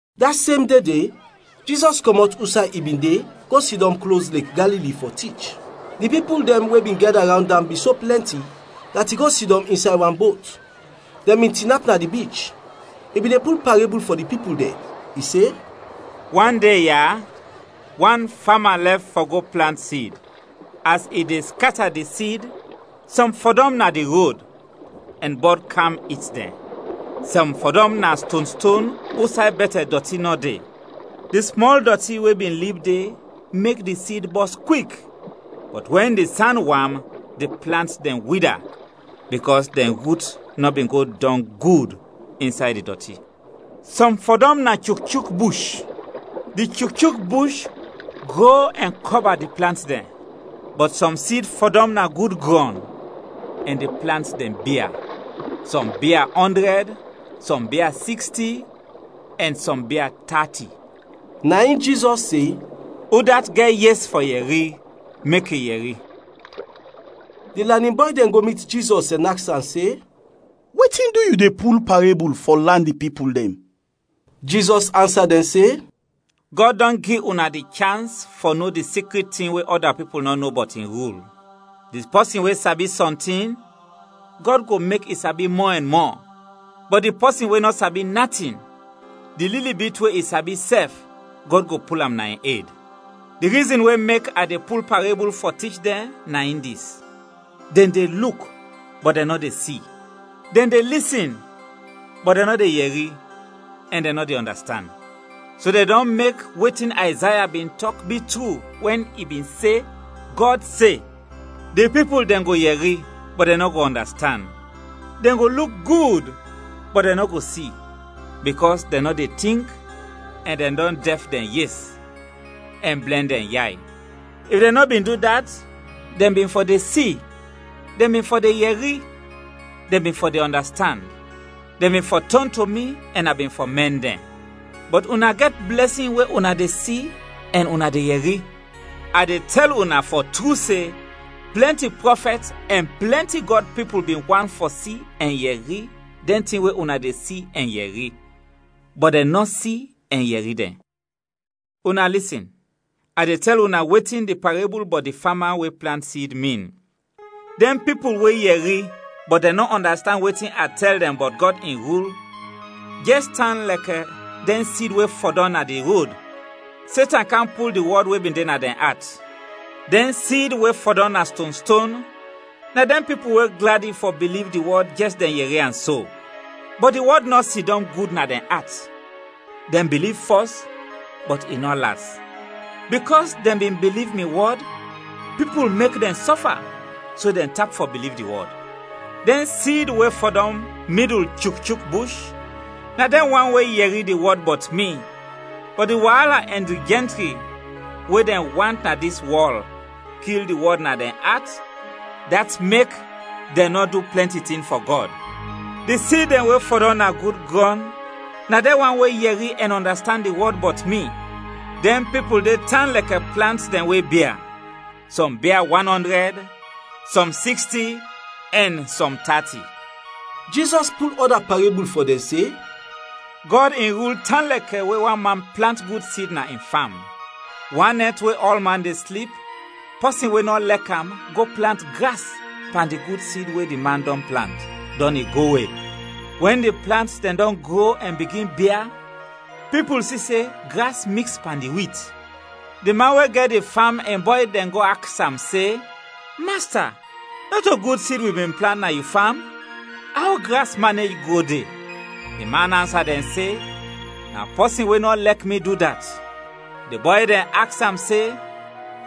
Da sem de de, Jizɔs kɔmɔt usay i bin de, go sidɔm klos Lek Galili fɔ tich. Di pipul dɛn we bin gɛda rawnd am bin so plɛnti, dat i go sidɔm insay wan bot. Dɛn bin tinap na di bich. I bin de pul parebul fɔ di pipul dɛn. I se, “Wan de ya, wan fama lɛf fɔ go plant sid. As i de skata di sid, sɔm fɔdɔm na di rod, ɛn bɔd kam it dɛn. Sɔm fɔdɔm na stonston usay bɛtɛ dɔti nɔ de. Di smɔl dɔti we bin lib de mek di sid bɔs kwik, bɔt wɛn di san wam, di plant dɛn wida, bikɔs dɛn rut nɔ bin go dɔng gud insay di dɔti. Sɔm fɔdɔm na chukchuk bush, di chukchuk bush gro ɛn kɔba di plant dɛn. Bɔt sɔm sid fɔdɔm na gud grɔn, ɛn di plant dɛn bia: sɔm bia ɔndrɛd, sɔm bia siksti, ɛn sɔm bia tati.” Na in Jizɔs se, “Udat gɛt yes fɔ yɛri, mek i yɛri.” Di lanin bɔy dɛn go mit Jizɔs ɛn aks am se, “Wetin du yu de pul parebul fɔ lan di pipul dɛn?” Jizɔs ansa dɛn se, “Gɔd dɔn gi una di chans fɔ no di sikrit tin we ɔda pipul nɔ no bɔt in rul. Di pɔsin we sabi sɔntin, Gɔd go mek i sabi mɔ ɛn mɔ; bɔt di pɔsin we nɔ sabi natin, di lili bit we i sabi sɛf, Gɔd go pul am na in ed. Di rizin we mek a de pul parebul fɔ tich dɛn, na in dis: dɛn de luk, bɔt dɛn nɔ de si; dɛn de lisin, bɔt dɛn nɔ de yɛri ɛn dɛn nɔ de ɔndastand. So dɛn dɔn mek wetin Ayzaya bin tɔk, bi tru, wɛn i bin se, Gɔd se, ‘Di pipul dɛn go yɛri, bɔt dɛn nɔ go ɔndastand, Dɛn go luk gud, bɔt dɛn nɔ go si, bikɔs dɛn nɔ de tink, ɛn dɛn dɔn dɛf dɛn yes, ɛn blɛn dɛn yay. If dɛn nɔ bin du dat, dɛn bin fɔ de si, dɛn bin fɔ de yɛri, dɛn bin fɔ de ɔndastand. Dɛn bin fɔ tɔn to mi ɛn a bin fɔ mɛn dɛn.’ “Bɔt una gɛt blɛsin we una de si ɛn una de yɛri. A de tɛl una fɔ tru se, plɛnti prɔfɛt ɛn plɛnti Gɔd pipul bin want fɔ si ɛn yɛri dɛn tin we una de si ɛn yɛri, bɔt dɛn nɔ si ɛn yɛri dɛn. “Una lisin, a de tɛl una wetin di parebul bɔt di fama we plant sid, min. Dɛn pipul we yɛri, bɔt dɛn nɔ ɔndastand wetin a tɛl dɛn bɔt Gɔd in rul, jɛs tan lɛkɛ dɛn sid we fɔdɔm na di rod. Setan kam pul di wɔd we bin de na dɛn at. Dɛn sid we fɔdɔm na stonston na dɛn pipul we gladi fɔ biliv di wɔd jɛs dɛn yɛri am so. Bɔt di wɔd nɔ sidɔm gud na dɛn at, dɛn biliv fɔs, bɔt i nɔ las. Bikɔs dɛn bin biliv mi wɔd, pipul mek dɛn sɔfa, so dɛn tap fɔ biliv di wɔd. Dɛn sid we fɔdɔm midul chukchuk bush na dɛn wan we yɛri di wɔd bɔt mi, bɔt di waala ɛn di jɛntri we dɛn want na dis wɔl kil di wɔd na dɛn at, dat mek dɛn nɔ du plɛnti tin fɔ Gɔd. Di sid dɛn we fɔdɔm na gud grɔn na dɛn wan we yɛri ɛn ɔndastand di wɔd bɔt mi. Dɛn pipul de tan lɛkɛ plant dɛn we bia: sɔm bia wan ɔndrɛd, sɔm siksti, ɛn sɔm tati.” Jizɔs pul ɔda parebul fɔ dɛn se, “Gɔd in rul tan lɛkɛ we wan man plant gud sid na in fam. Wan nɛt we ɔlman de slip, pɔsin we nɔ lek am go plant gras pan di gud sid we di man dɔn plant, dɔn i go we. Wɛn di plant dɛn dɔn gro ɛn bigin bia, pipul si se gras miks pan di wit. Di man we gɛt di fam in bɔy dɛn go aks am se, ‘Masta, nɔto gud sid wi bin plant na yu fam? Aw gras manej gro de?’ Di man ansa dɛn se, ‘Na pɔsin we nɔ lɛk mi du dat.’ Di bɔy dɛn aks am se,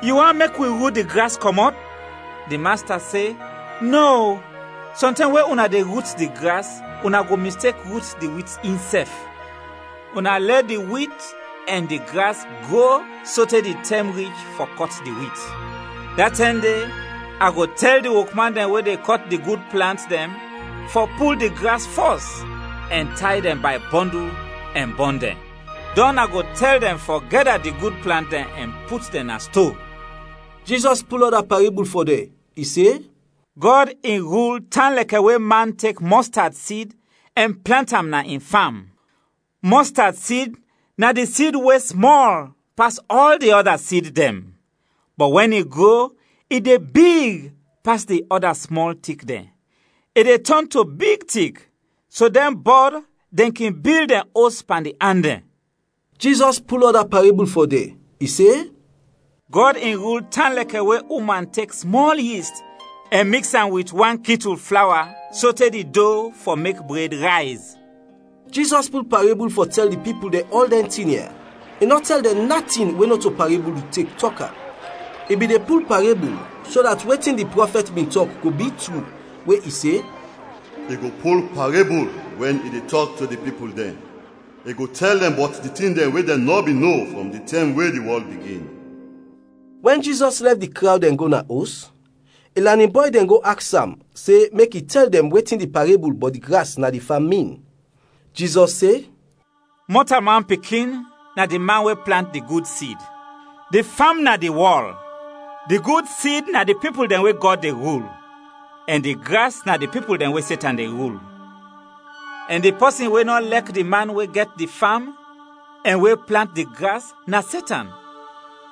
‘Yu want mek wi rut di gras kɔmɔt?’ Di masta se, ‘Nɔ, o, sɔntɛm we una de rut di gras, una go mistek rut di wit insɛf. Una lɛ di wit ɛn di gras gro sote di tɛm rich fɔ kɔt di wit. Da tɛm de, a go tɛl di wokman dɛn we de kɔt di gud plant dɛn fɔ pul di gras fɔs, ɛn tay dɛn bay bɔndul ɛn bɔn dɛn; dɔn a go tɛl dɛn fɔ gɛda di gud plant dɛn ɛn put dɛn na sto.’” Jizɔs pul ɔda parebul fɔ dɛn, i se, “Gɔd in rul tan lɛkɛ we man tek mɔstad sid ɛn plant am na in fam. Mɔstad sid na di sid we smɔl pas ɔl di ɔda sid dɛn, bɔt wɛn i gro, i de big pas di ɔda smɔl tik dɛn. I de tɔn to big tik, so dɛn bɔd dɛn kin bil dɛn os pan di an dɛn.” Jizɔs pul ɔda parebul fɔ dɛn, i se, “Gɔd in rul tan lɛkɛ we uman tek smɔl yist ɛn miks am wit wan kitul flawa sote di do fɔ mek bred rayz.” Jizɔs pul parebul fɔ tɛl di pipul dɛn ɔl dɛn tin ya, i nɔ tɛl dɛn natin we nɔto parebul i tek tɔk am. I bin de pul parebul, so dat wetin di prɔfɛt bin tɔk go bi tru, we i se, “I go pul parebul wɛn i de tɔk to di pipul dɛn. I go tɛl dɛn bɔt di tin dɛn we dɛn nɔ bin no frɔm di tɛm we di wɔl bigin.” Wɛn Jizɔs lɛf di krawd ɛn go na os, in lanin bɔy dɛn go aks am se mek i tɛl dɛn wetin di parebul bɔt di gras na di fam min. Jizɔs se, “Mɔtalman Pikin na di man we plant di gud sid. Di fam na di wɔl, di gud sid na di pipul dɛn we Gɔd de rul, ɛn di gras na di pipul dɛn we Setan de rul. Ɛn di pɔsin we nɔ lɛk di man we gɛt di fam, ɛn we plant di gras na Setan.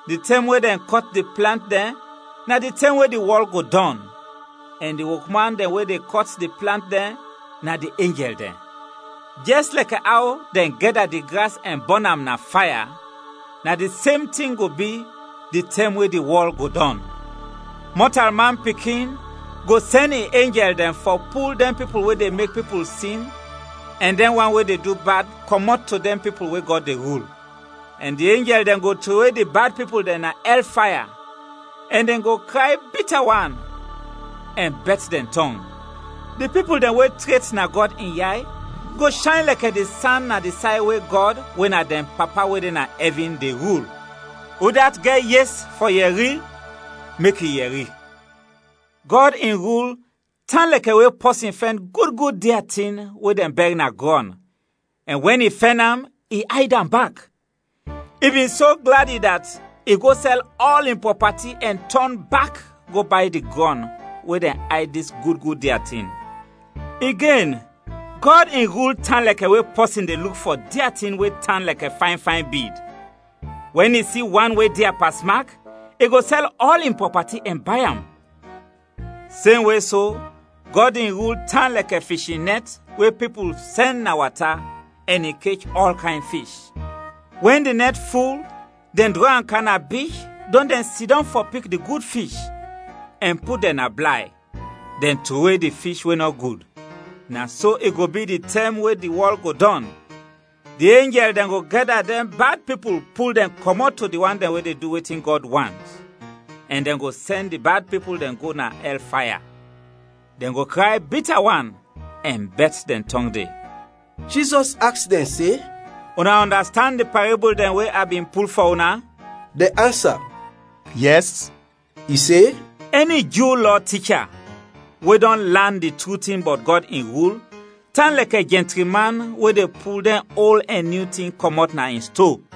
Di tɛm we dɛn kɔt di plant dɛn na di tɛm we di wɔl go dɔn, ɛn di wokman dɛn we de kɔt di plant dɛn na di enjɛl dɛn. Jɛs lɛkɛ aw dɛn gɛda di gras ɛn bɔn am na faya, na di sem tin go bi di tɛm we di wɔl go dɔn. Mɔtalman Pikin go sɛn in enjɛl dɛn fɔ pul dɛn pipul we de mek pipul sin ɛn dɛn wan we de du bad, kɔmɔt to dɛn pipul we Gɔd de rul. Ɛn di enjɛl dɛn go trowe di bad pipul dɛn na ɛl faya, ɛn dɛn go kray bita wan ɛn bɛt dɛn tɔng. Di pipul dɛn we tret na Gɔd in yay go shayn lɛkɛ di san na di say we Gɔd, we na dɛn Papa we de na ɛvin, de rul. Udat gɛt yes fɔ yɛri, mek i yɛri. “Gɔd in rul tan lɛkɛ we pɔsin fɛn gud gud dia tin we dɛn bɛr na grɔn, ɛn wɛn i fɛn am, i ayd am bak; i bin so gladi dat i go sɛl ɔl in prɔpati ɛn tɔn bak go bay di grɔn we dɛn ayd dis gud gud dia tin. “Igen, Gɔd in rul tan lɛkɛ we pɔsin de luk fɔ dia tin we tan lɛkɛ fayn fayn bid. Wɛn i si wan we dia pasmak, i go sɛl ɔl in prɔpati ɛn bay am. “Semwe so, Gɔd in rul tan lɛkɛ fishin nɛt we pipul sɛn na wata, ɛn i kech ɔl kayn fish. Wɛn di nɛt ful, dɛn drɔ am kam na bich, dɔn dɛn sidɔm fɔ pik di gud fish, ɛn put dɛn na blay; dɛn trowe di fish we nɔ gud. Na so i go bi di tɛm we di wɔl go dɔn, di enjɛl dɛn go gɛda dɛn bad pipul pul dɛn kɔmɔt to di wan dɛn we de du wetin Gɔd want, ɛn dɛn go sɛn di bad pipul dɛn go na ɛl faya, dɛn go kray bita wan ɛn bɛt dɛn tɔng de.” Jizɔs aks dɛn se, “Una ɔndastand di parebul dɛn we a bin pul fɔ una?” Dɛn ansa, “Yɛs!” I se, “Ɛni Ju Lɔ ticha, we dɔn lan di tru tin bɔt Gɔd in rul, tan lɛkɛ jɛntri man we de pul dɛn ol ɛn nyu tin kɔmɔt na in sto.”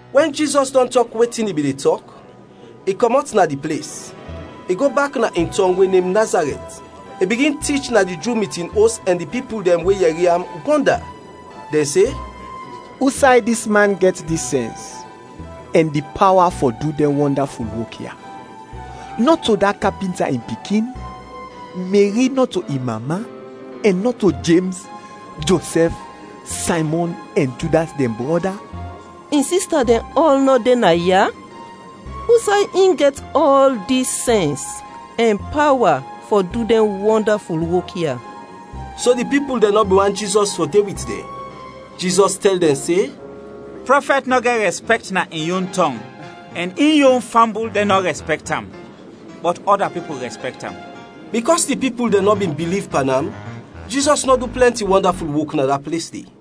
Wɛn Jizɔs dɔn tɔk wetin i bin de tɔk, i kɔmɔt na di ples. I go bak na in tɔng we nem Nazarɛt. I bigin tich na di Ju mitin os ɛn di pipul dɛn we yɛri am, wɔnda. Dɛn se, “Usay dis man gɛt dis sɛns, ɛn di pawa fɔ du dɛn wɔndaful wok ya? Nɔto da kapinta in pikin? Meri nɔto in mama, ɛn nɔto Jems, Josɛf, Saymɔn ɛn Judas dɛn brɔda? In sista dɛn ɔl nɔ de naya? Usay in gɛt ɔl dis sɛns ɛn pawa fɔ du dɛn wɔndaful wok ya?” So di pipul dɛn nɔ bin want Jizɔs fɔ de wit dɛn. Jizɔs tɛl dɛn se, “Prɔfɛt nɔ gɛt rɛspɛkt na in yon tɔng ɛn in yon fambul dɛn nɔ rɛspɛkt am, bɔt ɔda pipul rɛspɛkt am.” Bikɔs di pipul dɛn nɔ bin biliv pan am, Jizɔs nɔ du plɛnti wɔndaful wok na da ples de.